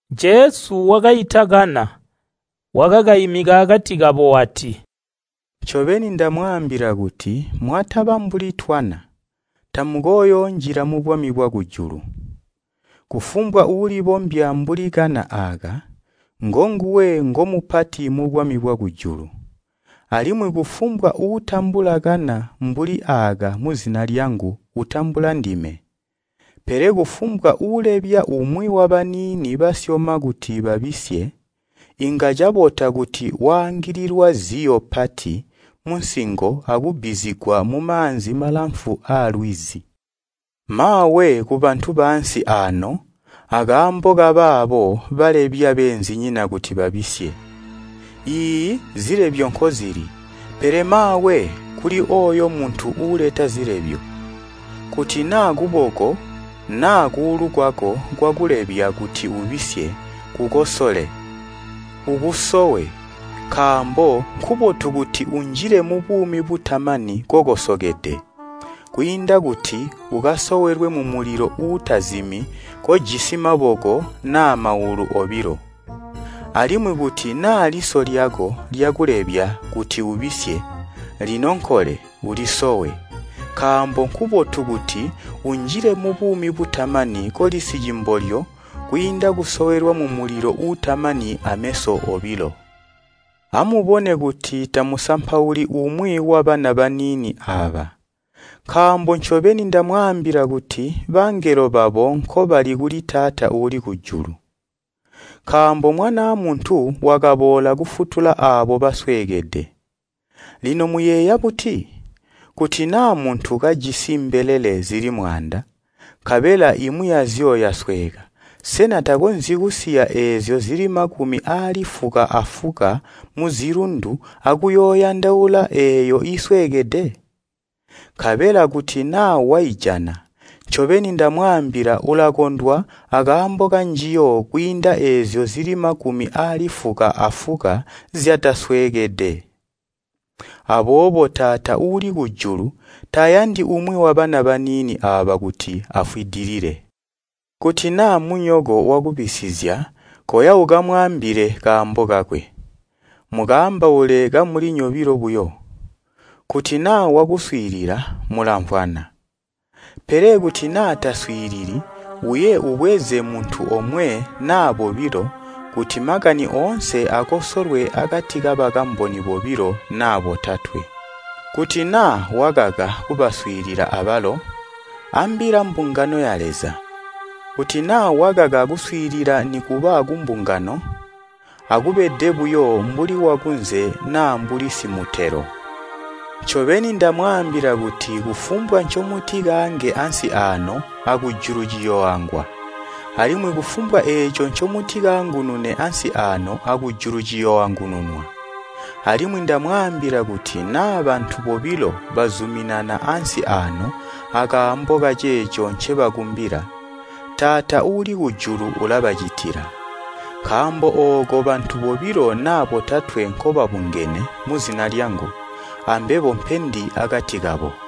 Jesu wakaita kana, wakakaimika akati kabo wati, “Ncobeni ndamwaambila kuti mwataba mbuli twana, tamukooyoonjila mubwami bwakujulu. Kufumbwa uulibombya mbuli kana aaka, ngonguwe ngomupati mubwami bwakujulu. Alimwi kufumbwa uutambula kana mbuli aaka muzina lyangu utambula ndime. “Pele kufumbwa uulebya umwi wabaniini basyoma kuti babisye, inga cabota kuti waangililwa ziyo pati munsingo akubbizigwa mumaanzi malamfu aalwizi. Maawe kubantu baansi aano akaambo kabaabo balebya beenzinyina kuti babisye! Iiyi zilebyo nkozili, pele maawe kuli ooyo muntu uuleta zilebyo! Kuti naa kuboko naa kuulu kwako kwakulebya kuti ubisye kukosole, ukusowe, nkaambo nkubotu kuti unjile mubuumi butamani kokosokede kwiinda kuti ukasowelwe mumulilo uutazimi kojisi maboko naa maulu obilo. Alimwi kuti naa liso lyako lyakulebya kuti ubisye, linonkole ulisowe, nkaambo nkubotu kuti unjile mubuumi butamani koli sicimbolyo kwiinda kusowelwa mumulilo uutamani ameso obilo. “Amubone kuti tamusampauli umwi wabana baniini aaba, nkaambo ncobeni ndamwaambila kuti bangelo babo nkobali kuli Taata uuli kujulu. Nkaambo Mwanaa Muntu wakaboola kufutula aabo basweekede.] Lino muyeeya buti? Kuti naa muntu kajisi mbelele zili mwaanda, nkabela imwi yazyo yasweeka, sena takonzyi kusiya eezyo zili makumi aali fuka afuka muzilundu akuyooyandaula eeyo iisweekede? Nkabela kuti naa waijana, ncobeni ndamwaambila ulakondwa akaambo kanjiyo kwiinda eezyo zili makumi aali fuka afuka zyatasweekede. Aboobo Taata uuli kujulu tayandi umwi wabana baniini aaba kuti afwidilile. “Kuti naa munyoko wakubisizya koya ukamwaambile kaambo kakwe. Mukaambaule kamuli nyobilo buyo. Kuti naa wakuswiilila mulamvwana. Pele kuti naa taswiilili, uye ubweze muntu omwe naa bobilo kuti makani oonse akosolwe akati kabakamboni bobilo naa botatwe. Kuti naa wakaka kubaswiilila abalo, ambila mbungano ya Leza. Kuti naa wakaka kuswiilila nikuba kumbungano, akubede buyo mbuli wakunze naa mbuli simutelo. “Ncobeni ndamwaambila kuti kufumbwa ncomutikaange ansi aano akujulu ciyooangwa. Alimwi kufumbwa eeco ncomutikaangunune ansi aano akujulu ciyooangununwa. Alimwi ndamwaambila kuti naa bantu bobilo bazuminana ansi aano akaambo kaceeco ncebakumbila, Taata uuli kujulu ulabacitila. Nkaambo ooko bantu bobilo naa botatwe nkobabungene muzina lyangu, ambebo mpendi akati kabo.”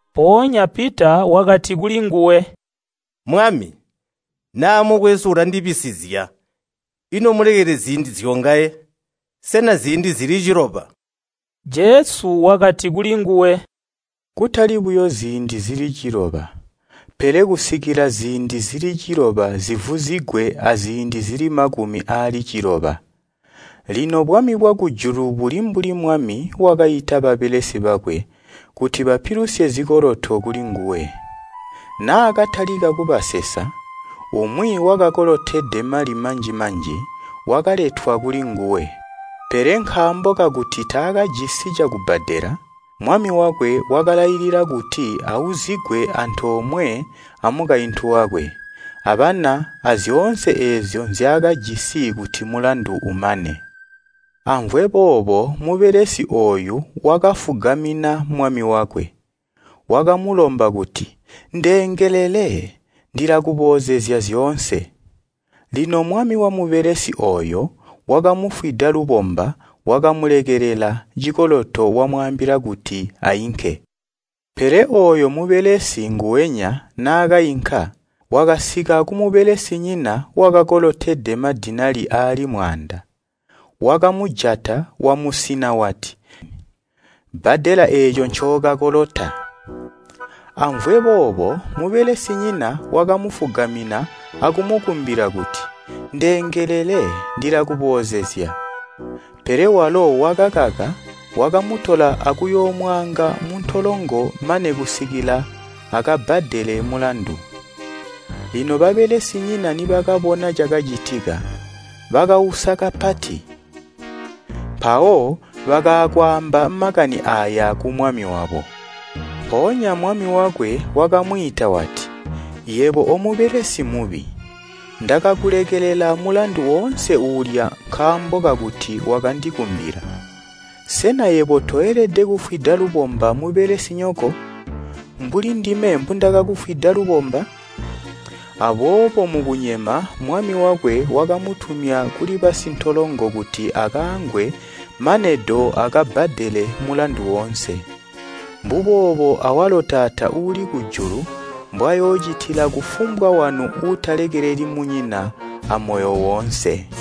Mpoonya Pita wakati kulinguwe, “Mwami, naa mukwesu ulandibisizya ino mmulekelele ziindi zyongaye? Sena ziindi zili ciloba?” Jesu wakati kulinguwe, “Kutali buyo ziindi zili ciloba, pele kusikila ziindi zili ciloba zivuzigwe aziindi zili makumi aali ciloba. “Lino bwami bwakujulu buli mbuli mwami wakaita babelesi bakwe kuti bapilusye zikoloto kulinguwe. Naakatalika kubasesa, umwi wakakolotede mali manji-manji wakaletwa kulinguwe. Pele nkaambo kakuti taakajisi cakubbadela, mwami wakwe wakalailila kuti auzigwe antoomwe amukaintu wakwe, abana azyoonse eezyo nzyaakajisi kuti mulandu umane. Amvwe boobo mubelesi ooyu wakafugamina mwami wakwe, wakamulomba kuti, ‘Ndeengelele, ndilakuboozezya zyoonse.’ Lino mwami wamubebelesi ooyo wakamufwida lubomba wakamulekelela cikoloto wamwaambila kuti ainke. “Pele ooyo mubelesi nguwenya naakainka, wakasika kumubelesinyina wakakolotede mali masyoonto buyo. Wakamujata wamusina wati, ‘Bbadela eeco ncookakolota!’ Amvwe boobo mubelesinyina wakamufugamina akumukumbila kuti ‘Ndeengelele, ndilakuboozezya!’ Pele walo wakakaka wakamutola akuyoomwaanga muntolongo mane kusikila akabbadele mulandu. Lino babelesinyina nibakabona cakacitika, bakausa kapati, mpawo bakaa kwaamba makani aaya kumwami wabo. Mpoonya mwami wakwe wakamwiita wati, ‘Yebo omubelesi mubi! Ndakakulekelela mulandu oonse uulya nkaambo kakuti wakandikumbila. Sena yebo toelede kufwida lubomba mubelesinyoko, mbuli ndime mbundakakufwida lubomba?’ Aboobo mukunyema mwami wakwe wakamutumya kuli basintolongo kuti akaangwe mane do akabbadele mulandu woonse. Mbuboobo awalo Taata uuli kujulu mbwayoocitila kufumbwa wanu uutalekeleli munyina amoyo woonse.”